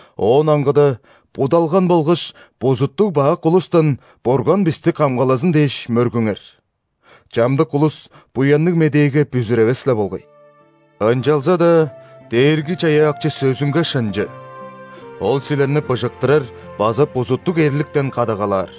Оон аңгыда будалган болгаш бузуттуг-бак улустан Бурган бисти камгалазын дээш мөргүңер: чамдык улус Буянныг Медээге бүзүревес-ле болгай. Ынчалза-даа Дээрги-Чаяакчы сөзүнге шынчы. Ол силерни быжыктырар база бузуттуг эрликтен кадагалаар.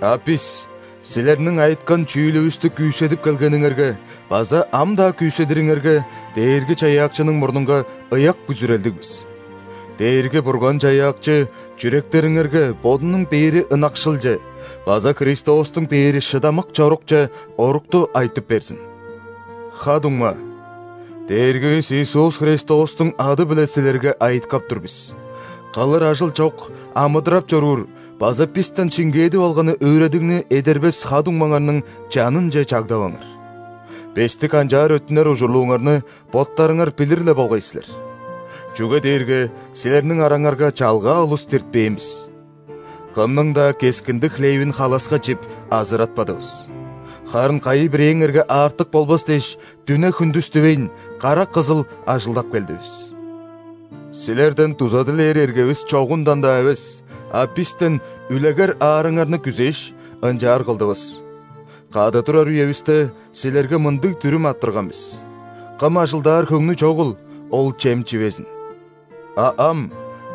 А бис силерниң айыткан чүүлүвүстү күүседип келгениңерге база ам-даа күүседириңерге Дээрги-Чаяакчының мурнунга ыяк бүзүрелдиг бис. Дээрги-Бурган-Чаяакчы чүректериңерге Бодунуң бээри ынакшылче база Христостуң бээри шыдамык чорукче орукту айтып берзин. Ха-дуңма, Дээргивис Иисус Христостуң ады-биле силерге айыткап тур бис: кылыр ажыл чок амыдырап чоруур база бистен шиңгээдип алганы өөредигни эдербес ха-дуңмаңарның чанынче чагдаваңар. Бисти канчаар өттүнер ужурлууңарны боттарыңар билир-ле болгай силер. Чүге дээрге силерниң араңарга чалгаа улус диртпээн бис. Кымның-даа кескинди хлевин халаска чип, азыратпадывыс, харын кайы-бирээңерге аартык болбас дээш, дүне-хүндүс дивейн, карак кызыл ажылдап келдивис. Силерден дуза дилээр эргевис чогундан-даа эвес, а бистен үлегер аарыңарны күзээш, ынчаар кылдывыс. Кады турар үевисте, силерге мындыг дүрүм арттырган бис: «Кым ажылдаар хөңнү чогул, ол чем чивезин!» А ам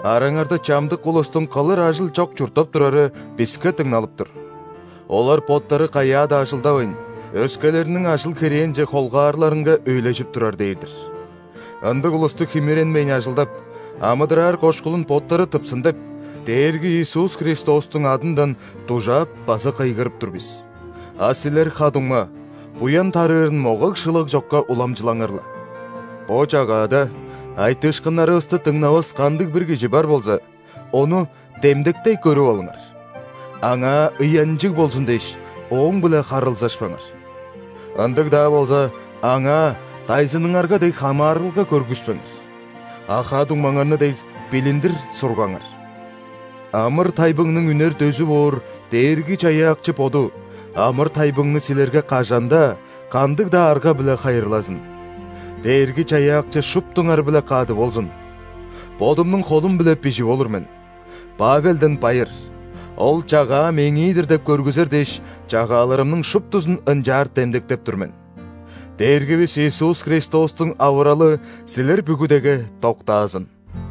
араңарда чамдык улустуң кылыр ажыл чок чурттап турары биске дыңналып тур. Олар боттары каяа-даа ажылдавайн, өскелерниң ажыл-херээнче холгаарлаарынга өйлежип турар дээр-дир. Ындыг улусту химиренмейн ажылдап, амыдыраар кошкулун боттары тыпсын деп, Дээрги Иисус Христостуң адындан дужаап база кыйгырып тур бис. А силер, ха-дуңма, буян тарыырын могаг-шылаг чокка уламчылаңар-ла. Бо чагаада айтыышкыннарывысты дыңнавас кандыг-бир кижи бар болза, ону демдектей көрүп алыңар. Аңаа ыянчыг болзун дээш, ооң-биле харылзашпаңар. Ындыг-даа болза, аңаа дайзыныңарга дег хамаарылга көргүспеңер, а ха-дуңмаңарны дег, билиндир сургаңар. Амыр-тайбыңның үнер дөзү боор Дээрги-Чаяакчы Боду амыр-тайбыңны силерге кажан-даа, кандыг-даа арга-биле хайырлазын. Дээрги-Чаяакчы шуптуңар-биле кады болзун! Бодумнуң холум-биле бижип олур мен: Павелден байыр. Ол чагаа мээңии-дир деп көргүзер дээш, чагааларымның шуптузун ынчаар демдектеп тур мен. Дээргивис Иисус Христостуң авыралы силер бүгүдеге доктаазын!